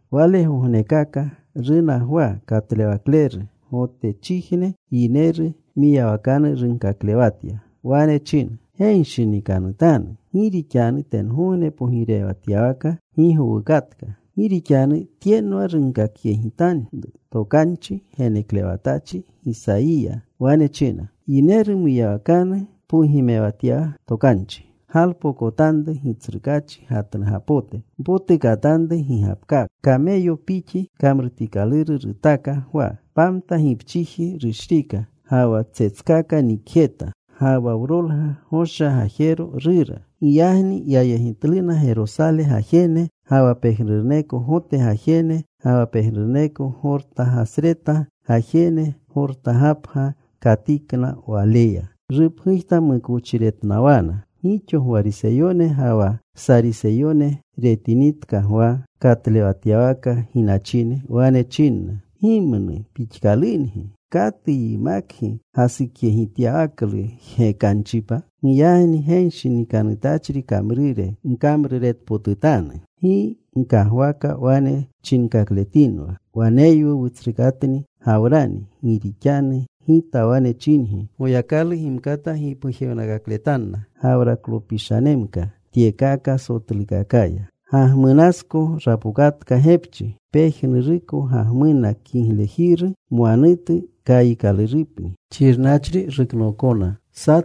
Walegognekaka runa Gwa Katlewakleru. Gotechijne yineru mwiyawakanu runkaklewatya. Wane china, “Genshinikanutanu, gi rixanu tengogne pogirewatyawaka gi gowukatka. Gi rixanu tyenwa runkakyegitanru tokanchi geneklewatachri Gisayiya. Wane china: Yineru mwiyawakanu pogimewatya tokanchi: Galpokotanru Gitsrukaachi gatnugapote; Mpotukatanru gigapkaka.” Kameyopixi kamrutikaluru rutaka Gwa. Pamta gipchiji rushrika. Ga wa tsetskaka nikjeta. Ga wa wrolga gosha gajero rura. Giyagni yayegitluna Gerosale gajene, ga wa pejnuruneko Gote gajene, ga wa pejnuruneko Gortagasreta gajene. Gortagapga katikna waleya. Rupgujtamukochiretnawana. Gixo Gwariseyone ga wa Sariseyone retinitka Gwa katlewatyawaka ginachine, wane chinna, “¡Gimnu pixkalungi! ¿Katu yimakgi gasukyegityawaklu jgekanchipa? Giyagni genshinikanuwlu kamrure gkamruretpotutanu. Gi gkagwaka wane chinkakletinwa, ‘Waneywu wutsrukatni Gawrani.’ Gi rixanu gita wane chingi, Goyakalu gimkata gipgujewnakakletanna Gawraklopishanemka tyekaka sotlukakaya. Gagmunasko rapokatka gepchi. Pejnuruko gagmuna kiglejiru mwanutu kayiikalurupni. Xirnachri ruknookona.”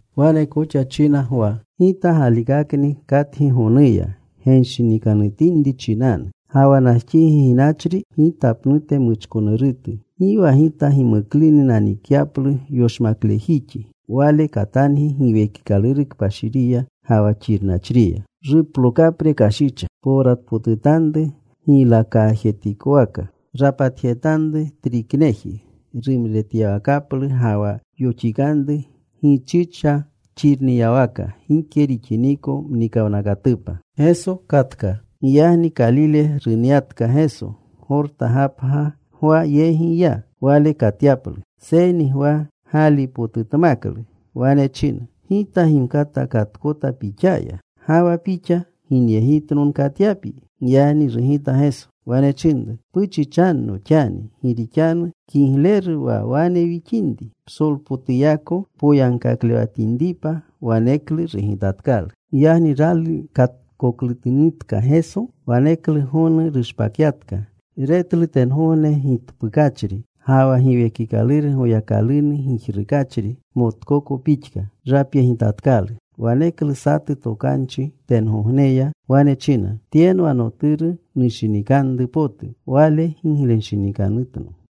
Wane koxa china Gwa, “Gita galikakni katgi gonuya genshinikanutinri chinanu. Ga wa najxigi ginachri gita pnute muchkonurutu. Gi wa gita gimukluni nanikyaplu yoshmaklejixi. Wale katangi Giwekikaluru Kpashiriya ga wa xirnachriya. Ruplokapre kashicha. Powratpotutanru giylakaajetikowaka. Rapatjetanru trikneji rumretyawakaplu, ga wa yoxikanru gichicha xirniyawaka gike rixiniko muwnakatupa.” Giyagni Kalile runyatka Geso. Gorta gapga Gwa yegi ya, wale katyaplu. Seyni Gwa gaalipotutmaklu. Wane china, “Gita gimkata katkota Pixaya, ¿ga wa Pixa ginyegitno nkatyapyi?” Giyagni rugita Geso. Wane chinru, “Puchichanno xani. Gi rixanu kigleru wane wixinri, psolpotuyako wpoyagkaklewatinripa.” Waneklu rugitatkalu. Giyagni rali katkoklunutka Geso, waneklu gonu rushpakyatka. Retlu tengogne gitpukachri ga wa Giwekikaluru Goyakalunu gijrukachri motkoko pixka. Rapyegitatkalu. Waneklu satu tokanchi tengogneya, wane china, “Tyenwa Noturu nushinikanru potu. Wale giglenshinikanutno.”